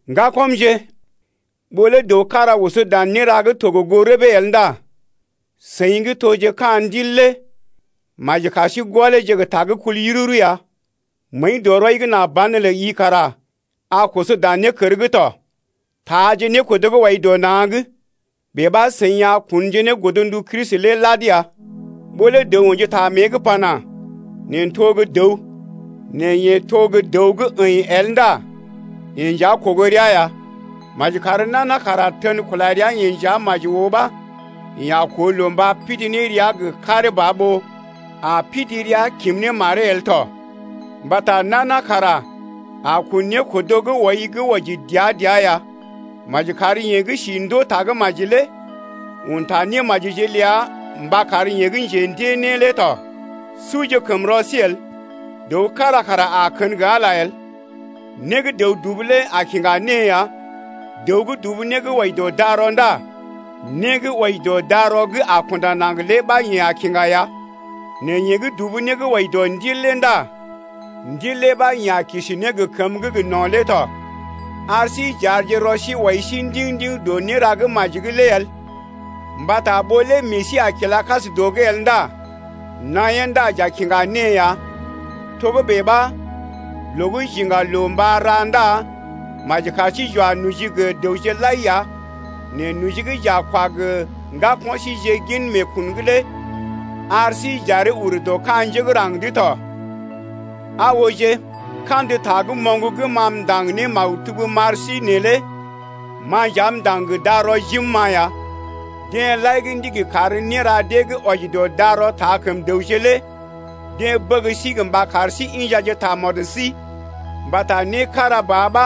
Ŋgakɔmje, ɓó lé dəw kára oso dan néra gə́ to gə goo rəbee el ndá seḭ gə́ toje ka̰ Ndil lé maji kar sí gɔleeje gə ta gə́ kul yururu ya. Məəi dɔ rɔi’g nà banelə i kara a koso dan nékər’g tɔ. Taaje nékodo gə́ wɔi dɔ na̰’g, bèe ɓa seḭ a kunje ne godndu Kristi lé lad ya. Ɓó lé dəw ə̰ji ta mée’g pana: Neḛ n’to gə́ dəw, nɛ yeḛ to gə́ dəw gə́ əḭ el ndá yeḛ nja kogo rəa ya. Maji kar nana kara tən kula rəa-yeḛ nja maji oo ɓa, yeḛ a koo loo mba pidi ne rəa gə karee ba, ɓó a pidi rəa kim ne maree el tɔ. Mbata nana kara a kun nékodo gə́ wɔi gə́ wɔji dəa-dəa ya. Maji kar yeḛ gə́ d’aw ndée Tagə́maji lé un ta némajije ləa mba kar yeḛ gə́ njendée né lé tɔ. Suje kəm rɔ sí el, dəw kára kara a kən gə Ala el. Né gə́ dəw dubu lé a kiŋga née ya. Dəw gə́ dubu né gə́ wɔji dɔ darɔ ndá né gə́ wɔji dɔ darɔ gə́ a kunda naŋg lé ɓa yeḛ a kiŋga ya, nɛ yeḛ gə́ dubu né gə́ wɔji dɔ Ndil lé ndá ndil lé ɓa yeḛ a kisi ne gə kəmə gə́ gə no̰ lé tɔ. Ar sí j’arje rɔ sí wɔi sí ndiŋ-ndiŋ dɔ néra gə́ maji’g lé el mbata ɓó lé meḛ sí a kila kas dɔ’g el ndá naḭyee ndá j’a kiŋga née ya. Togə́bè ɓa loo gə́ j’iŋga loo mba ra ndá maji kar sí j’wa noji gə dəwje lai ya nɛ noji gə́ j’a kwa gə ŋgako̰ síjeḛ gin meekun’g lé ar sí j’aree ur dɔ ka̰ njé gə́ raŋg’d tɔ. Aa ooje, kandə ta gə́ moŋg gə́ ma m’ndaŋg ne maktub m’ar sí neelé ma nja m’ndaŋg gə darɔ jim-ma ya. Deḛ lai gə́ ndigi kar néra dee gə́ wɔji dɔ darɔ taa kəm dəwje lé deḛ bəg sí mba kar sí injaje tamɔd sí mbata né kára ba ɓa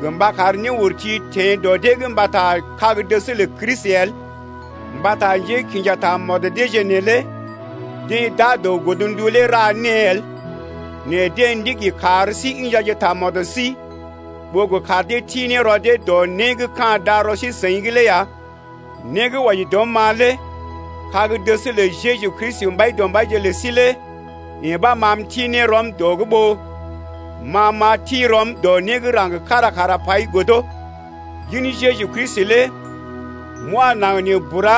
gə mba kar néurti teḛ dɔ dee’g mbata kag-dəs lə Kristi el. Mbata njékḭja tamɔd deeje neelé deḛ d’aa dɔ godndu lé ra née el, nɛ deḛ ndigi kar sí injaje tamɔd sí ɓó gə kar dee ti ne rɔ dee dɔ né gə́ ka̰ darɔ sí-seḭ’g lé ya. Né gə́ wɔji dɔm ma lé kag-dəs lə Jeju Kristi Mbaidɔmbaije lə sí lé yee ɓa ma m’ti ne rɔm dɔ’g ɓó ma m’a ti rɔm dɔ né gə́ raŋg kára kara pai godo. Gin Jeju Kristi lé m’wa naŋg nee bura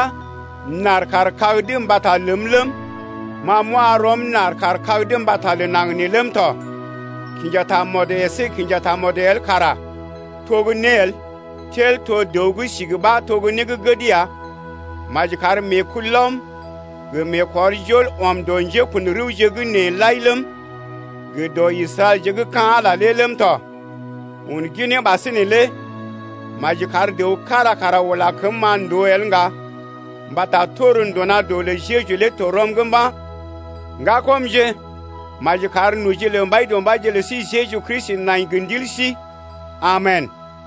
m’ɗar kaar kag’d mbata ləm ləm, ma m’wa rɔm m’ɗar kar kag’d mbata lə naŋg neelé ləm tɔ. Kinja tamɔd əsé kinja tamɔd el kara to gə́ né el, tel to dəw gə́ sigi ɓa to né gə́ gəd ya. Maji kar meekulɔm gə meekɔrjol ɔm dɔ njékun rəwje gə́ nee lai ləm, gə dɔ Israɛlje gə́ ka̰ Ala ləm tɔ. Un ginee ɓasinè lé maji kar dəw kára kara ula kəm-ma ndòo el ŋga mbata tor nduna doo lə Jeju lé to rɔm’g mba̰. Ŋgakɔmje, maji kar noji lə Mbaidɔmbaije lə sí Jeju Kristi nai gə ndil sí tɔ! Amen!